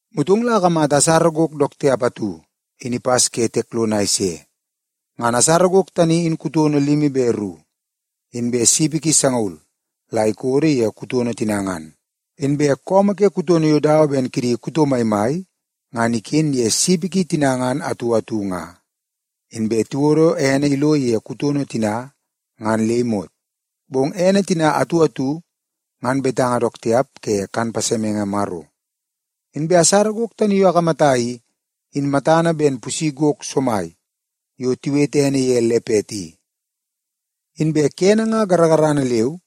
Motong la akamata asara gok dook tiap atu in ipas ke tiek lono a ise. Ngan asara gok tani in kutono limi be ru, inbe sipi ki sangaul la ikodo ye kutono tina ngan. Inbe su ke kutono yo dawa ben kidi kuto maimai ngan iken ye sipi ki tina atu atu nga. Inbe tiwodo ene ilo ye kutono tina ngan le imot, bong ene tina atu atu ngan betanga dook tiap ke kan pasemenge Maro. Inbe asara gok tani yo akamata i, in matana ben pusi gok somai yo tiwete ene ye lepet i. Inbe kene nga garagarana leu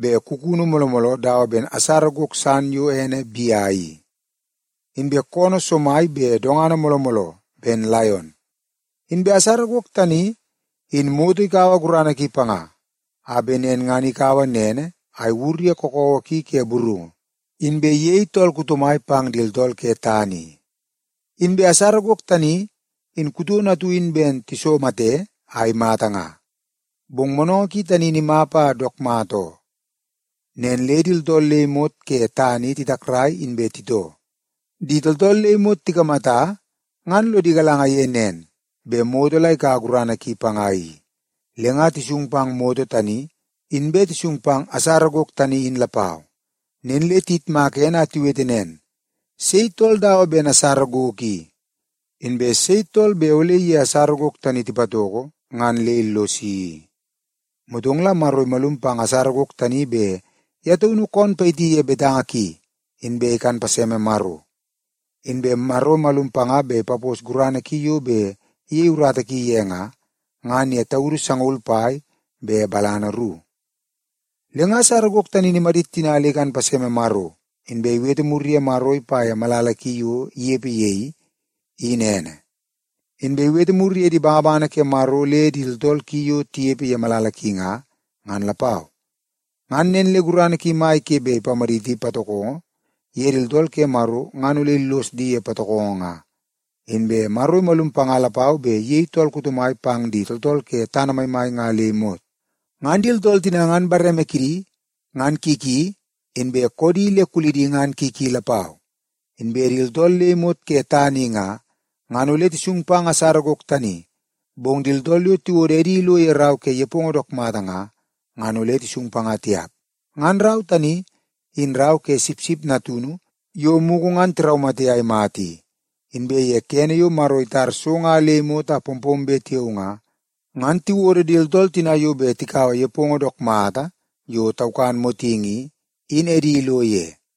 be kukunu mooloo mooloo dawa ben asara gok san yo ene bea i. Inbe koonoo somai be dongana mooloo mooloo ben laion. Inbe asara gok tani, in moto ikaua gurana ki panga, a bet nen ngan ikaua nene a iwur ye kakawa ki ke burungu, inbe iyei tool kuto mai pang di tooltool ke tana i. Inbe asara gok tani in kutono atu in ben tisomate a imata nga, bong monongo ki tani in imap a dook mata oo. Nen le di tooltool le imot ke tana i titakrai inbe titoo. Di tooltool le imot tikamata ngan lodi galanga ye nen, bet moto la ikaua gurana ki panga i. Le nga tisung pang moto tani, inbe tisung pang asara gok tani in lapau. Nen le tiyitmaka ene a tiwete nen, “Sei tool dawa ben asara gok i? Inbe sei tool bet ole iye asara gok tani tipatoko ngan le illosi i?” Motong la Maro imalum pang asara gok tani bet ye taunu koon payiti ye betanga ki, inbe ikan paseme Maro. Inbe Maro imalum panga bet ipapos gurana ki yo bet iyei urata ki ye nga, ngan ye taudu sangaul pai be balana ru. Le nga asara gok tani in imadit tina le ikan paseme Maro, inbe iwete mur ye Maro ipa ye malala ki yo inepe ye i, in ene. Inbe iwete mur ye di bangabangana ke Maro le di tooltool ki yo tinepe ye malala ki nga, ngan lapau. Ngan nen le gurana ki mai ke bet ipamaditi patokongo ye di tooltool ke Maro ngan ole illos di ye patokongo nga. Inbe Maro imalum panga lapau bet iyei tool kuto mai pang di tooltool ke tana maimai nga le imot. Ngan di tooltool tina ngan bareme kidi ngan ki ki inbe koodi le kulidi ngan ki ki lapau. Inbe di tooltool le imot ke tana i nga, ngan ole tisung pang asara gok tani. Bong di tooltool yo tiwodo edi ilo ye rau ke nepongo dook mata nga, ngan ole tisung panga tiap. Ngan rau tani, in rau ke Sipsip Natunu yo mugu ngan tiraumate a imata i. Inbe ye kene yo Maro itar so nga le imot a pompombe tiao nga, ngan tiwodo di tooltool tina yo bet tikaua nepongo dook mata yo taukan motingi i, in edi ilo ye.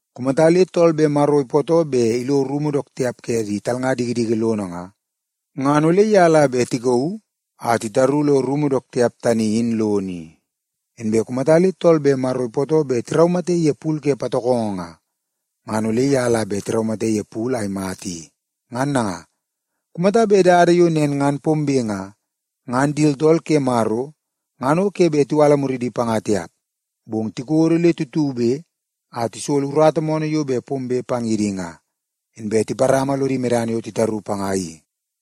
Kumata le tool bet Maro ipootoo bet ilo rumu dook tiap ke di talnga dikidiki lono nga, ngan ole ye la bet tikauu a titaru lo rumu dook tiap tani in lono i. Inbe kumata le tool bet Maro ipootoo bet tiraumate ye pul ke patokongo nga, ngan ole ye la bet tiraumate ye pul a imata i. Ngan nanga, kumata bet dada yo nen ngan pombe nga, ngan di tooltool ke Maro ngan o ke bet tiwala muridi panga tiap, bong tikodo le tutube a tisolo urata moonoo yo bet pombe pang ye di nga, inbe tiparama lodi medana yo titaru panga i.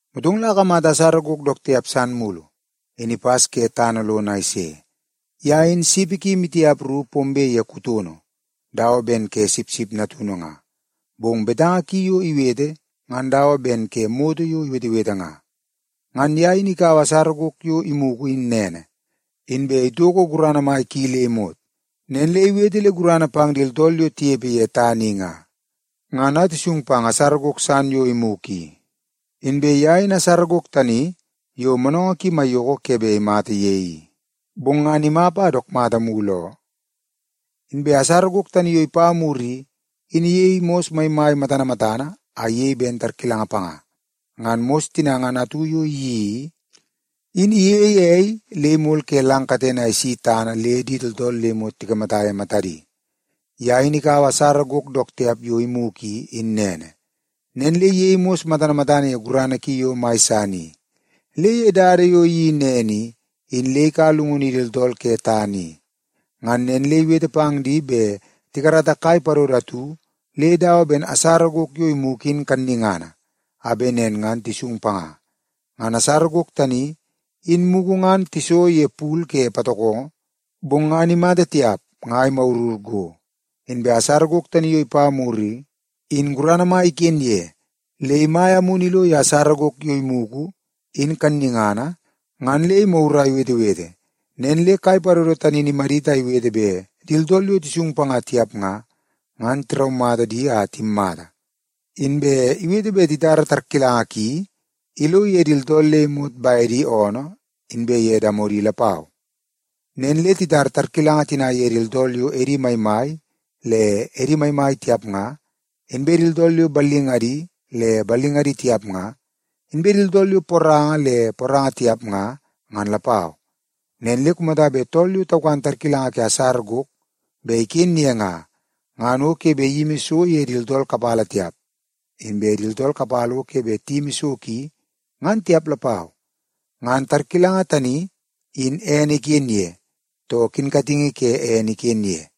Motong la akamata asara gok dook tiap san mulu, in ipas ke tana lono a ise. Ye in sipi maitiap ru pombe ye kutono dawa ben ke sipsip natunu nga, bong betanga ki yo iwete ngan dawa ben ke moto yo iwetewete nga. Ngan ye in ikaua asara gok yo imugu in nene, inbe itoko gurana mai ki le imot. Nen le iwete le gurana pang di tooltool yo tinepe ye tana i nga, ngan a tisung pang asara gok san yo imugu i. Inbe ye in asara gok tani yo moonoongoo ki maiyoko ke bet imata ye i, bong ngan imap a dook mata mulu oo. Inbe asara gok tani yo ipa mur i, in iyei mos maimai matana matana a iyei ben tarkilanga panga. Ngan mos tina ngan atu yo iyeii i, in iyeie ei le imol ke lang katene a isi tana le di tooltool le imot tikamata ye matadi. Ye in ikaua asara gok dook tiap yo imugu i, in nene, nen le iyei mos matana matana ye gurana ki yo mai san i. Le ye dada yo iyeii i, in le ikaua llungunu ye di tooltool ke tana i. Ngan nen le iwete pang di bet tikarata kai padodo atu le dawa ben asara gok yo imugu in kannungana, a bet nen ngan tisung panga. Ngan asara gok tani, in mugu ngan tiso ye pul ke patokongo, bong ngan imata tiap nga imagurur go. Inbe asara gok tani yo ipa mur i, in gurana mai iken ye, le imaia amunu ilo ye asara gok yo imugu in kannungana ngan le imagur a iwetewete. Nen le kai padodo tani in imadit a iwete bet di tooltool yo tisung panga tiap nga, ngan tiraumata di a timmata. Inbe iwete bet titara tarkilanga ki ilo ye di tooltool le imot bedi oonoo inbe ye damodi lapau. Nen le titar tarkilanga tina ye di tooltool yo edi maimai le edi maimai tiap nga, inbe di tooltool yo ballingadi le ballingadi tiap nga, inbe di tooltool yo poranga le poranga tiap nga, ngan lapau. Nen le kumata bet tool yo taukan tarkilanga ke asara gok bet iken ye nga, ngan o ke bet iyimi so ye di tooltool kapala tiap, inbe di tooltool kapala o ke bet tiyimi so ki, ngan tiap lapau. Ngan tarkilanga tani in ene iken ye, too kinkatingi ke ene iken ye.